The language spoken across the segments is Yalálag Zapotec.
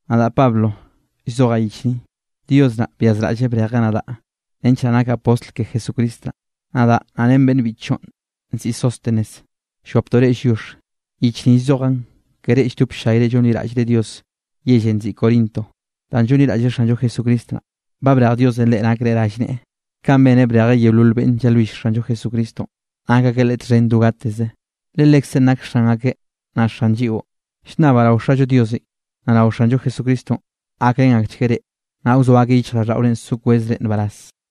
Nadaꞌ Pablo llzojaꞌ yich ni. Dios naꞌ byazraꞌlleꞌ brejeꞌ nadaꞌ nench naꞌ nakaꞌ postl ke Jesucristo naꞌ. Nadaꞌ naꞌ ren beꞌnn biꞌchllonꞌ nziꞌi Sóstenes llwaptoꞌ reꞌ lliox. Yich ni llzojaꞌn ke reꞌ lldop ll-llayre llonliraꞌllre Diosenꞌ yellenꞌ nziꞌi Corinto danꞌ llonliraꞌllre Xanllo Jesucristo naꞌ, ba brej Diosenꞌ reꞌ nakre rallneꞌe, kanꞌ beneꞌ brejeꞌ yeolol beꞌnn llalwill Xanllo Jesucristonꞌ, nak akeꞌ Leꞌe txhen do gateze, le Lekzeꞌn nak Xan akeꞌ naꞌ Xan lliꞌo. Llnnabaꞌ rao Xallo Diosenꞌ, naꞌ rao Xanllo Jesucristonꞌ gakrén akchgueꞌ reꞌ, naꞌ wzoa akeꞌ yichjraꞌlldaꞌore so kwezre nbaraz.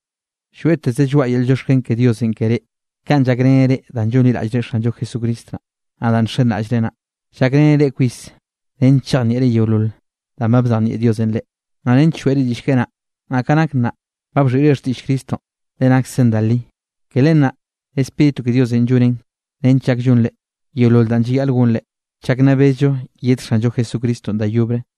Lloeꞌteze lloaꞌa yel llioxken ke Diosenꞌ ke reꞌ, kanꞌ llakreneꞌ reꞌ danꞌ llonliraꞌllre Xanllo Jesucristo naꞌ. Naꞌ danꞌ nxenraꞌllreꞌ naꞌ, llakreneꞌ reꞌ kwis nench chejnieꞌre yeolol danꞌ ba bzejnieꞌ Diosenꞌ reꞌ, naꞌ nench lloeꞌre diꞌll keꞌe naꞌ. Naꞌ ka nak nnaꞌ, ba bxhiꞌre xtiꞌll Cristonꞌ, le naksen da li. Ke len naꞌ Spíritu ke Diosenꞌ llonen nench llak llonre yeolol danꞌ llayaꞌl gonrenꞌ, chak nna bezllo yed Xanllo Jesucristonꞌ da yobre.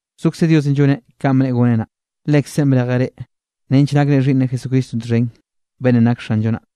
Zokze Diosenꞌ lloneꞌ kanꞌ bneꞌe goneꞌ naꞌ, Lekzeꞌn brejeꞌ reꞌ nench nakre xhiꞌnneꞌ Jesucristonꞌ txhen, beꞌnnenꞌ nak Xanllo naꞌ.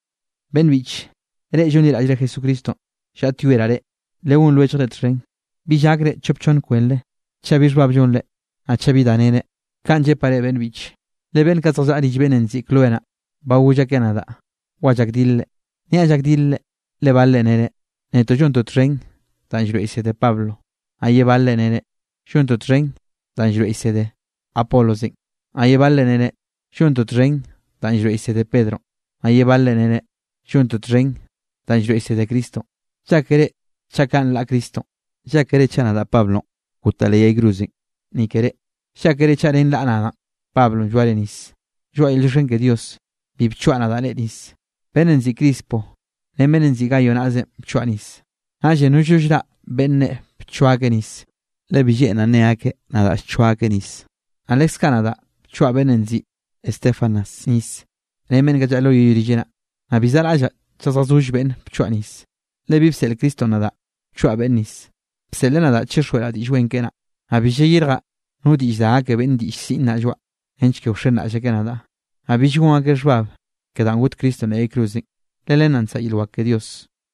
Beꞌnn biꞌche, reꞌ llonliraꞌllre Jesucristonꞌ, llaꞌtyoeraꞌ reꞌ, legón lwelljre txhen, bill gakre chop chonn kwenre chaꞌ bi xhbab llonre, naꞌ chaꞌ bi da nere. Kaꞌn llepaꞌ reꞌ beꞌnn biꞌche, le beꞌnn kaꞌ zjallaꞌa rill beꞌnnenꞌ nziꞌi Cloé naꞌ, ba goll akeꞌ nadaꞌ wa llakdilre. Niaꞌ llakdilre, le balre nere: “Netoꞌ llontoꞌ txhen danꞌ llroeꞌ llsede Pablonꞌ.” Naꞌ ye balre nere: “Llontoꞌ txhen danꞌ llroeꞌ llsede Apolosenꞌ.” Naꞌ ye balre nere: “Llontoꞌ txhen danꞌ llroeꞌ llsede Pedronꞌ.” Naꞌ ye balre nere: “Llontoꞌ txhen danꞌ llroeꞌ llsede Cristonꞌ.” ¿Llákere chaꞌ kaꞌ nlaꞌ Cristonꞌ? ¿Llákere chaꞌ nadaꞌ Pablonꞌ gotaꞌ leꞌ yay cruzenꞌ ni ke reꞌ? ¿Llákere chaꞌ ren raꞌa nadaꞌ Pablonꞌ blloare nisenꞌ? Lloaꞌa yel llioxken ke Dios, bi bchoaꞌ nadaꞌ reꞌ nis. Beꞌnnenꞌ nziꞌi Crispo ren beꞌnnenꞌ nziꞌi Gayo naꞌzenꞌ bchoaꞌ nis. Naꞌllenꞌ nollno llraꞌ beꞌnn nne bchoa akeꞌ nis, le bi lleꞌnraꞌ nne akeꞌ nadaꞌ llchoa akeꞌ nis. Naꞌ leskaꞌ nadaꞌ bchoaꞌ beꞌnnenꞌ nziꞌi Estéfanas nis ren beꞌnn kaꞌ llaꞌa lo yoꞌ rilleꞌ naꞌ. Naꞌ bi zaꞌraꞌllaꞌ chaꞌ zjazoll beꞌnn bchoaꞌ nis. Le bi bseꞌl Cristonꞌ nadaꞌ wchoaꞌ beꞌnne nis, bseꞌleꞌ nadaꞌ chixjweꞌraꞌ Diꞌll Wen keꞌe naꞌ. Naꞌ bi llayirjaꞌ no diꞌll da gake beꞌnne diꞌll siꞌn naꞌ lloaꞌa, nench ke wxenraꞌll akeꞌ nadaꞌ, naꞌ bill gon akeꞌ xhbab ke danꞌ got Cristonꞌ leꞌ yay cruzenꞌ, le len naꞌ nsaꞌa yel wak ke Dios.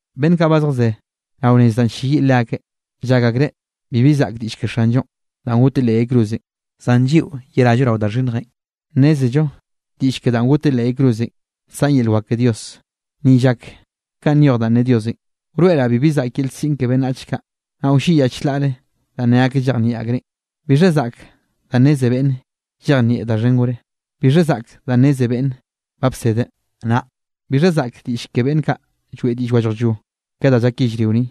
Beꞌnn kaꞌ ba zjazé rao nez danꞌ ll-lleyiꞌ leakeꞌ, llak akreꞌ bibi zaꞌk diꞌll ke Xanllonꞌ danꞌ goteꞌ leꞌ yay cruzenꞌ. Zan lliꞌo yerallo rao da xhinnjenꞌ, nnézello diꞌll ke danꞌ goteꞌ leꞌ yay cruzenꞌ nsaꞌn yel wak ke Dios. Ni llak kanꞌ nyoj danꞌ ne Diosenꞌ: Wroeꞌraꞌ bibi zaꞌk yel siꞌn ke beꞌnnach kaꞌ, Naꞌ wlliꞌyaꞌ chlaꞌre danꞌ ne akeꞌ llejnieꞌ akreꞌn. ¿Bixha zaꞌk danꞌ nneze beꞌnnenꞌ llejnieꞌ da xhen gore? ¿Bixha zaꞌk danꞌ nneze beꞌnnenꞌ ba bsedeꞌ? Naꞌ ¿bixha zaꞌk diꞌll ke beꞌnn kaꞌ lloeꞌ diꞌll wallajllo ke da llak yellrio ni?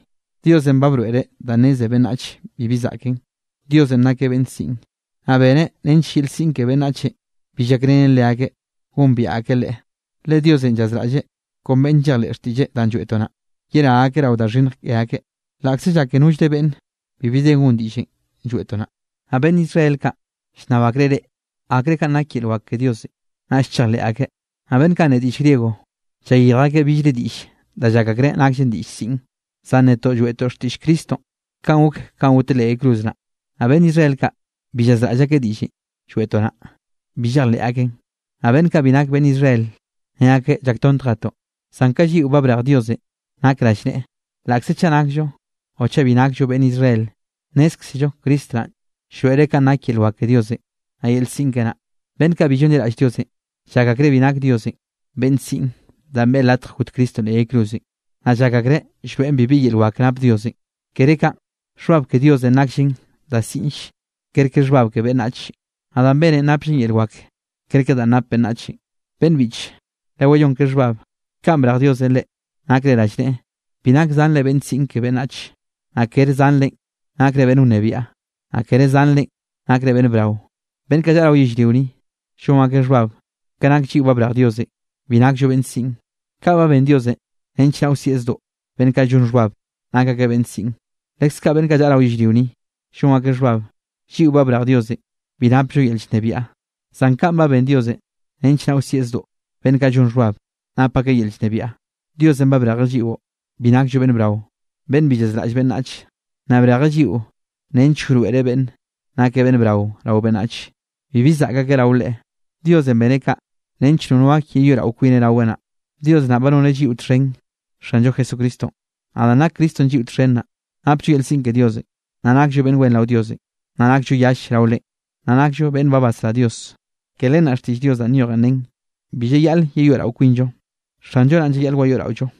Diosenꞌ ba broeꞌreꞌ danꞌ nneze beꞌnnachenꞌ bibi zaꞌken. Diosenꞌ nakeꞌ beꞌnn siꞌn, naꞌ beneꞌ nench yel siꞌn ke beꞌnnachenꞌ bi llakrenen leakeꞌ gombiaꞌ akeꞌ Leꞌe. Le Diosenꞌ llazraꞌlleꞌ kon beꞌnn llejleꞌ xtiꞌlleꞌ danꞌ lloeꞌtoꞌ naꞌ, yerá akeꞌ rao da xhinnj ke akeꞌ, laꞌkze llake nollre beꞌnne bibi de gon diꞌllenꞌ lloeꞌtoꞌ naꞌ. Naꞌ beꞌnn Israel kaꞌ llnnab akreꞌ reꞌe akreꞌ, kanꞌ nak yel wak ke Diosenꞌ, naꞌll chejleꞌ akeꞌ. Naꞌ beꞌnn kaꞌ nne diꞌll griego, llayirj akeꞌ billre diꞌll da llak akreꞌ nakll diꞌll siꞌn. Zan netoꞌ lloeꞌtoꞌ xtiꞌll Cristonꞌ kanꞌ gok kanꞌ goteꞌ leꞌ yay cruz naꞌ. Naꞌ beꞌnn Israel kaꞌ bi llazraꞌll akeꞌ diꞌllenꞌ lloeꞌtoꞌ naꞌ, bi llejleꞌ akeꞌn. Naꞌ beꞌnn kaꞌ bi nak beꞌnn Israel, ne akeꞌ llaktontjetoꞌn. Zan ka lliꞌo ba brej Diosenꞌ nak rallneꞌe, laꞌkze chaꞌ nakllo o chaꞌ bi nakllo beꞌnn Israel, nnézkzello Cristo naꞌn llroeꞌreꞌ kanꞌ nak yel wak ke Diosenꞌ, naꞌ yel siꞌn keꞌe naꞌ. Beꞌnn kaꞌ bi llonliraꞌll Diosenꞌ, llak akreꞌ bi nak Diosenꞌ beꞌnn siꞌn danꞌ beꞌe latj got Cristonꞌ leꞌ yay cruzenꞌ, naꞌ llak akreꞌ llroeꞌn bibi yel wak nap Diosenꞌ. Kere kaꞌn, xhbab ke Diosenꞌ nakllen da siꞌnll kerke xhbab ke beꞌnnachenꞌ, naꞌ danꞌ beneꞌn napllen yel wak kerke danꞌ nap beꞌnnachenꞌ. Beꞌnn biꞌche, lewayón ke xhbab, kanꞌ brej Diosenꞌ reꞌ nakre rallneꞌe, bi nak zanre beꞌnn siꞌn ke beꞌnnach, naꞌ kere zanrenꞌ nakre beꞌnn wnebiaꞌ, naꞌ kere zanrenꞌ nakre beꞌnn brao. Beꞌnn kaꞌ llaꞌa rao yellrio ni, llon akeꞌ xhbab ke nak lliꞌo ba brej Diosenꞌ, bi nakllo beꞌnn siꞌn. Kaꞌ ba ben Diosenꞌ nench naꞌ wsieꞌ zdoꞌ beꞌnn kaꞌ llon xhbab nak akeꞌ beꞌnn siꞌn. Leskaꞌ beꞌnn kaꞌ llaꞌa rao yellrio ni, llon akeꞌ xhbab, lliꞌo ba brej Diosenꞌ bi napllo yel llnebiaꞌ. Zan kaꞌn ba ben Diosenꞌ nench naꞌ wsieꞌ zdoꞌ beꞌnn kaꞌ llon xhbab nap akeꞌ yel llnebiaꞌ. Diosenꞌ ba brejeꞌ lliꞌo, bi nakllo beꞌnn brao, beꞌnn bi llazraꞌll beꞌnnach, naꞌ brejeꞌ lliꞌo nench wroeꞌreꞌ beꞌnnenꞌ nak beꞌnn brao rao beꞌnnachenꞌ, bibi zaꞌk akeꞌ rao Leꞌe. Diosenꞌ beneꞌ kaꞌ nench nono gak yeyoeꞌrao kwineꞌ raweꞌ naꞌ. Dios naꞌ ba noneꞌ lliꞌo txhen Xanllo Jesucristonꞌ, naꞌ danꞌ nak Cristonꞌ lliꞌo txhen naꞌ, napllo yel siꞌn ke Diosenꞌ, naꞌ nakllo beꞌnn wen rao Diosenꞌ, naꞌ nakllo yall rao Leꞌen, naꞌ nakllo beꞌnn ba basrá Dios. Ke len naꞌ xtiꞌll Dios danꞌ nyojen nen: “Bi llayaꞌl yeyoeꞌrao kwinllo, Xanllo naꞌn llayaꞌl wayoeꞌraollo.”